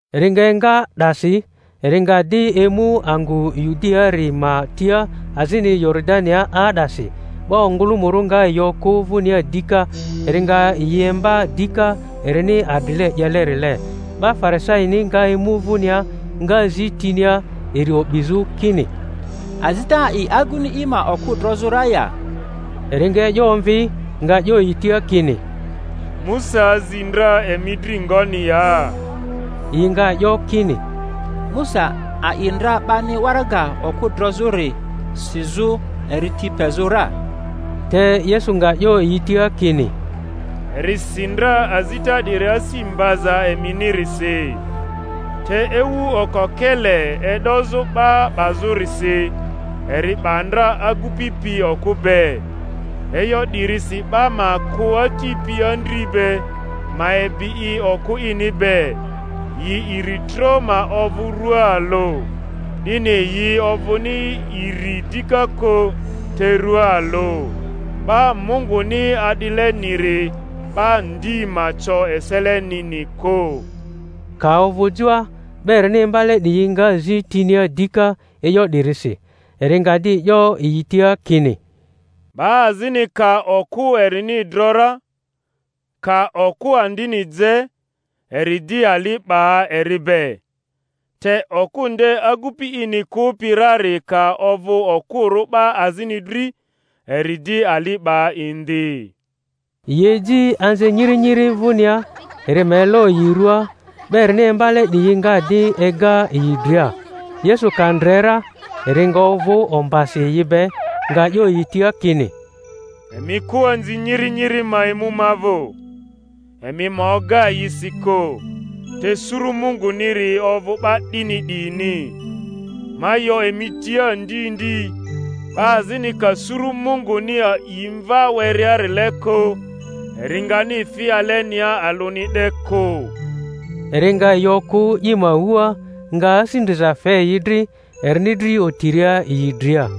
Eri nga enga 'dasi, eri nga di emu angᴜ Yudiaari ma tia azini Yoridania 'aa'dasi; 'ba ongᴜlᴜmᴜrᴜ nga yi okᴜ vᴜnia dika, eri nga yi imba dika erini adrile 'yelerile. 'Ba Farisaini nga emu vᴜnia, nga zi tinia, eri o'bizᴜ, kini, Azita a'i aguni i ma okᴜ drozᴜ ra ya? Eri nga e'yo omvi, nga 'yo yi tia kini, Musa azi ndra emi dri ngoni ya? Yi nga 'yo kini, Musa a'i ndra 'bani waraga okᴜ drozᴜri sizᴜ eri ti pezᴜ ra. Te Yesu nga 'yo yi tia kini, Eri si ndra azita 'diri asi mbaza eminirisi. Te ewu okokele e'dozᴜ 'ba 'bazᴜrisi, eri 'ba ndra agupi pi okᴜ be. E'yo 'dirisi 'ba ma kᴜ ati pi andri be, ma ebi i okᴜ ini be, yi iri tro ma ovᴜ rua alᴜ. 'Dini yi ovᴜni iri dika kᴜ, te rua alᴜ. 'Ba Munguni a'dileniri, 'ba ndi ma co eselenini kᴜ. Ka ovᴜ joa, 'ba erini imbale 'diyi nga zi tinia dika e'yo 'dirisi. Eri nga di 'yo yi tia kini, 'Ba azini ka okᴜ erini dro ra, ka okᴜ andini je, eri di ali 'ba eri be; te okᴜ nde agupi ini kᴜpi rari ka ovᴜ okᴜrᴜ 'ba azini dri, eri di ali 'ba indi. Yi eji anzi nyiri nyiri vᴜnia, eri ma elo yi rua; 'ba erini imbale 'diyi nga di ega yi dria. Yesu ka ndre ra, eri nga ovᴜ ombasi yi be, nga 'yo yi tia kini, Emi kᴜ anzi nyiri nyiri ma emu ma vᴜ, emi ma oga yi si kᴜ; te suru Munguniri ovᴜ 'ba 'dini 'diyini. Ma 'yo emi tia ndi ndi, 'ba azini ka suru Munguni a'i mva werearile kᴜ, eri ngani fi alenia alᴜni 'de kᴜ. Eri nga yi okᴜ i ma wua, nga asi ndriza fe yi dri, erini dri otiria yi dria.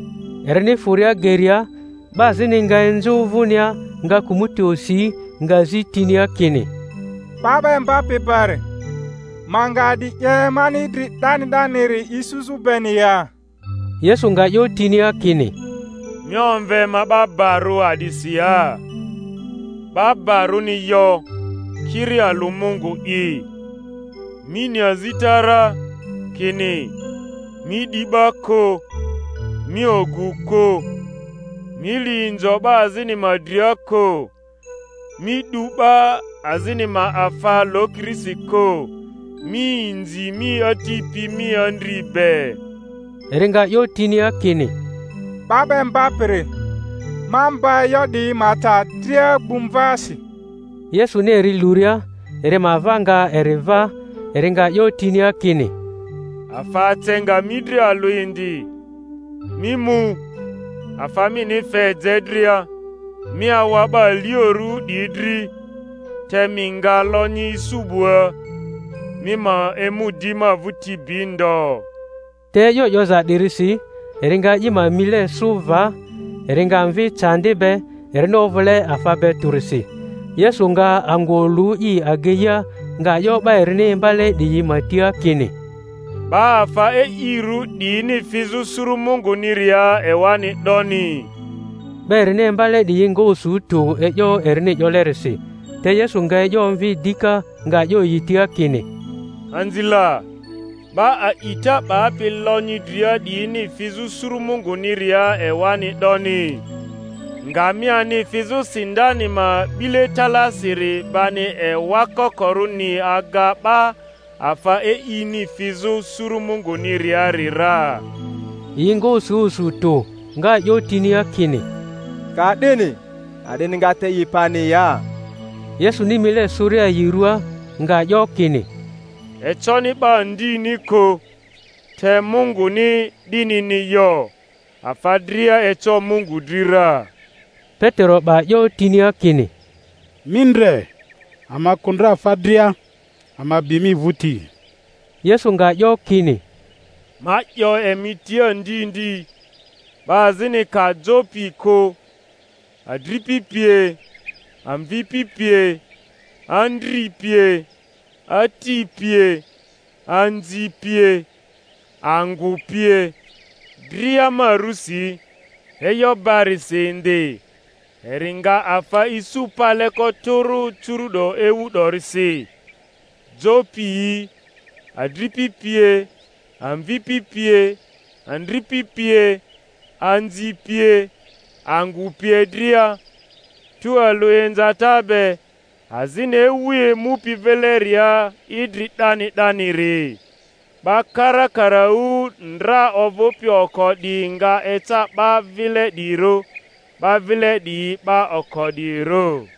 Erini fᴜria geria, 'ba azini nga enzᴜ vᴜnia, nga kᴜmᴜti osi, nga zi tinia kini, 'Ba 'ba Imbapi bari, ma nga a'di 'ye, mani idri 'dani 'daniri isuzᴜ beni ya? Yesu nga 'yo tinia kini, Mi omve ma barᴜ a'disi ya? 'Ba barᴜni yo, kiri alᴜ Mungu'i. Mi ni azita ra, kini: Mi 'di 'ba kᴜ, Mi ogᴜ kᴜ, Mi li inzo ‘ba azini ma dria kᴜ, Mi 'du 'ba azini ma afa lokirisi kᴜ, Mi inzi mi ati pi mi andri be. Eri nga 'yo tinia kini, 'Ba 'ba Imbapiri, ma mba e'yo 'diyi ma ta dria gbu mvasi. Yesuni eri luria, eri ma ava nga eri va, eri nga 'yo tinia kini, Afa ace nga mi dri alᴜ indi; mi mu, afa mini fe je dria, mi awa 'ba aliorᴜ 'diyi dri, te mi nga lonyi isu 'bua; mi ma emu di ma vᴜti bi ndo. Te e'yo 'yoza 'dirisi eri nga i ma mile sᴜ va, eri nga mvi candi be, erini ovᴜle afa be tᴜrisi. Yesu nga angᴜ olu i ageia, nga 'yo 'ba erini imbale 'diyi ma tia kini, 'Ba afa e'irᴜ 'diyini fizᴜ suru Munguniria ewani 'doni! 'Ba erini imbale 'diyi nga osu tᴜ e'yo erini 'yolerisi. Te Yesu nga e'yo omvi dika, nga 'yo yi tia kini, Anzi la, 'ba a'ita 'bapi lonyi dria 'diyini fizᴜ suru Munguniria ewani 'doni! Ngamiani fizᴜ sindani ma 'bile talaasiri bani ewa kokorᴜni aga 'ba afa e'ini fizᴜ suru Munguniriari ra. Yi nga osu osu tᴜ, nga 'yo tinia kini, Ka'dini a'dini nga te i pani ya? Yesuni mile sᴜria yi ruaa, nga 'yo kini, Econi 'ba ndini kᴜ, te Munguni 'dinini yo; afa dria eco Mungu dri ra. Petero 'ba 'yo tinia kini, Mi ndre, ama kᴜ ndra afa dria, ama bi mi vᴜti. Yesu nga 'yo kini, Ma 'yo emi tia ndi ndi, 'ba azini ka jo pi kᴜ, adripi pie, amvipi pie, andri pie, ati pie, anzi pie, angᴜ pie, dria ma rᴜsi, e'yo barisi indi, eri nga afa isu paleko tᴜrᴜ curu'do ewu 'dorisi, jo piyi, adripi pie, amvipi pie, andripi pie, anzi pie, angᴜ pie dria, tualᴜ inzata be; azini ewu emupi vileria idri 'dani 'daniri. 'Ba karakaraᴜ ndra ovᴜpi oko 'diyi nga eca 'ba vile 'diyirᴜ, 'ba vile 'diyi 'ba oko 'diyirᴜ.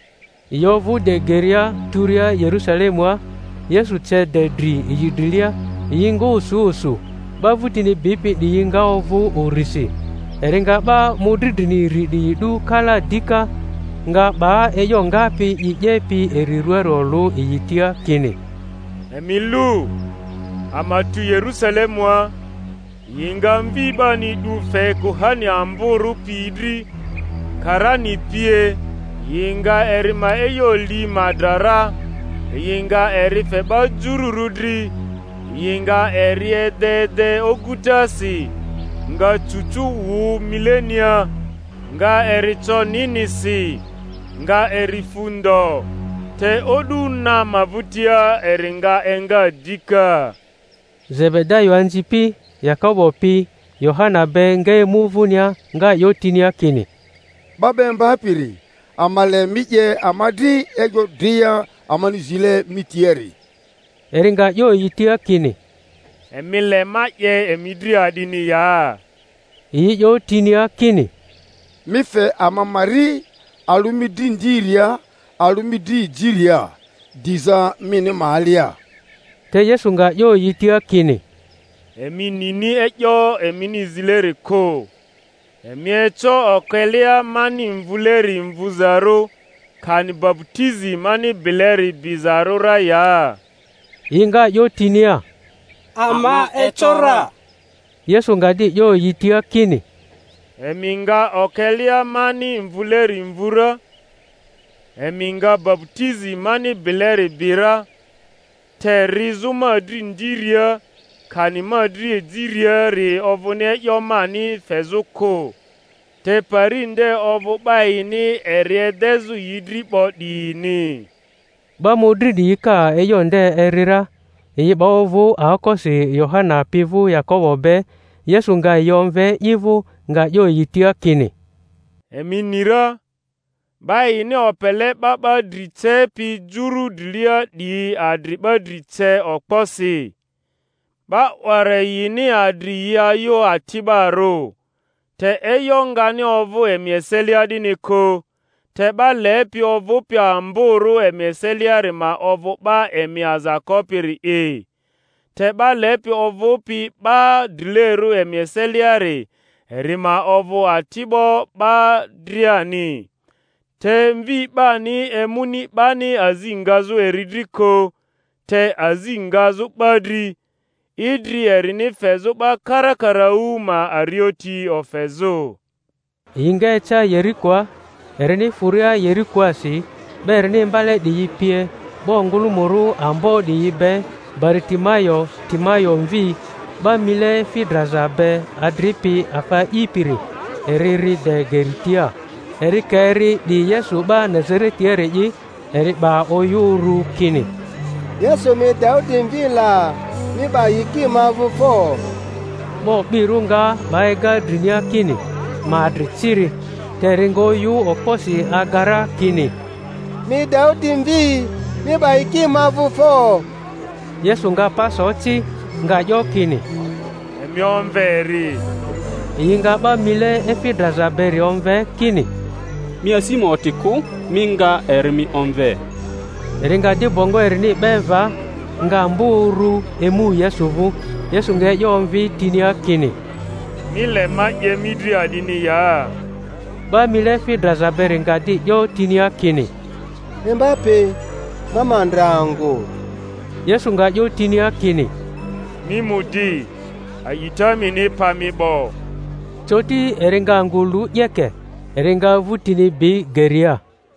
Yi ovᴜ de geria turia Yerᴜsalemua, Yesu ce de dri yi drilia; yi nga osu osu, 'ba vᴜtini bipi 'diyi nga ovᴜ urisi. Eri nga 'ba mᴜdri drini iri 'diyi 'du kalaa dika, nga 'ba e'yo ngapi i 'yepi eri ruaari olᴜ yi tia, kini, Emi lu, ama tu Yerusalemua; yi nga Mvi 'bani 'du fe kuhani amborᴜ piyi dri, karani pie; yi nga eri ma e'yo li ma dra ra, yi nga eri fe 'ba jururᴜ dri; yi nga eri ede ede ogutasi, nga cucu wᴜ milenia, nga eri co ninisi, nga eri fu ndo; te o'du na ma vᴜtia eri nga enga dika. Zebedayo anzipi Yakobo pi Yohana be, nga emu vᴜnia, nga 'yo tinia kini, 'Ba 'ba Imbapiri, ama le mi 'ye ama dri e'yo dria amani zile mi tiari. Eri nga 'yo yi tia kini, Emi le ma 'ye emi dri a'dini ya? Yi 'yo tinia kini, Mi fe ama ma ri, alᴜ mi dri ndiria, alᴜ mi dri ejiria, diza mini ma alia. Te Yesu nga 'yo yi tia kini, Emi nini e'yo emini zileri kᴜ. Emi eco okelea mani mvuleri mvuzarᴜ, kani baputizi mani bileri bizarᴜ ra ya? Yi nga 'yo tinia, Ama eco ra. Yesu nga di 'yo yi tia kini, Emi nga okelea mani mvuleri mvu ra; emi nga baputizi mani bileri bi ra; te rizᴜ ma dri ndiria, kani ma dri ejiriari ovᴜni e'yo mani fezᴜ kᴜ, te pari nde ovᴜ 'ba yini eri edezᴜ yi dri 'bo 'diyini. 'Ba mᴜdri 'diyi ka e'yo nde eri ra, yi 'ba ovᴜ aokosi Yohana pi vᴜ Yakobo be. Yesu nga yi omve i vᴜ, nga 'yo yi tia kini, Emi ni ra, 'ba yini opele 'ba 'ba dri cepi juru drilia 'diyi adri 'ba dri ce okposi; 'ba 'wara yini adri yi ayᴜ ati'barᴜ. Te e'yo ngani ovᴜ emi eselia 'dini kᴜ; te 'ba lepi ovᴜpi amborᴜ emi eseliari ma ovᴜ 'ba emi aza kopiri’i, te 'ba lepi ovᴜpi 'ba drilerᴜ emi eseliari, eri ma ovᴜ ati'bo 'ba driani. Te Mvi 'bani emuni 'bani azi ngazᴜ eri dri kᴜ, te azi ngazᴜ 'ba dri, idri erini fezᴜ 'ba karakaraᴜ ma arioti ofezᴜ. Yi nga eca Yerikoa; erini fᴜria Yerikoasi 'ba erini imbale 'diyi pie 'ba ongᴜlᴜmᴜrᴜ ambo 'diyi be, Baritimayo Timayo mvi, 'ba mile efi draza be adripi afa a'ipiri, eri ri de geri tia. Eri ka eri 'di Yesu 'ba Nazaretiari'i, eri 'ba oyᴜ uru kini, Yesu mi Daudi mvi la! mi 'ba yiki ma vᴜ fo! 'Ba o'birᴜ nga 'ba ega drinia kini ma adri ciri; te eri nga oyᴜ okposi aga ra kini, Mi Daudi mvi, mi 'ba yiki ma vᴜ fo! Yesu nga pa so ci, nga 'yo kini, Emi omve eri. Yi nga 'ba mile efi draza beri omve, kini, Mi asi ma oti kᴜ; mi nga, eri mi omve. Eri nga di bongo erini 'be va, nga mbᴜ uru, emu Yesu vᴜ. Yesu nga e'yo omvi tinia kini, Mi le ma 'ye mi dri a'dini ya? 'Ba mile efi draza beri nga di 'yo tinia kini, Imbapi, ma ma ndre angᴜ. Yesu nga 'yo tinia kini, Mi mu di; a'ita mini pa mi 'bo. Coti eri nga angᴜ lu 'yeke, eri nga vᴜtini bi geria.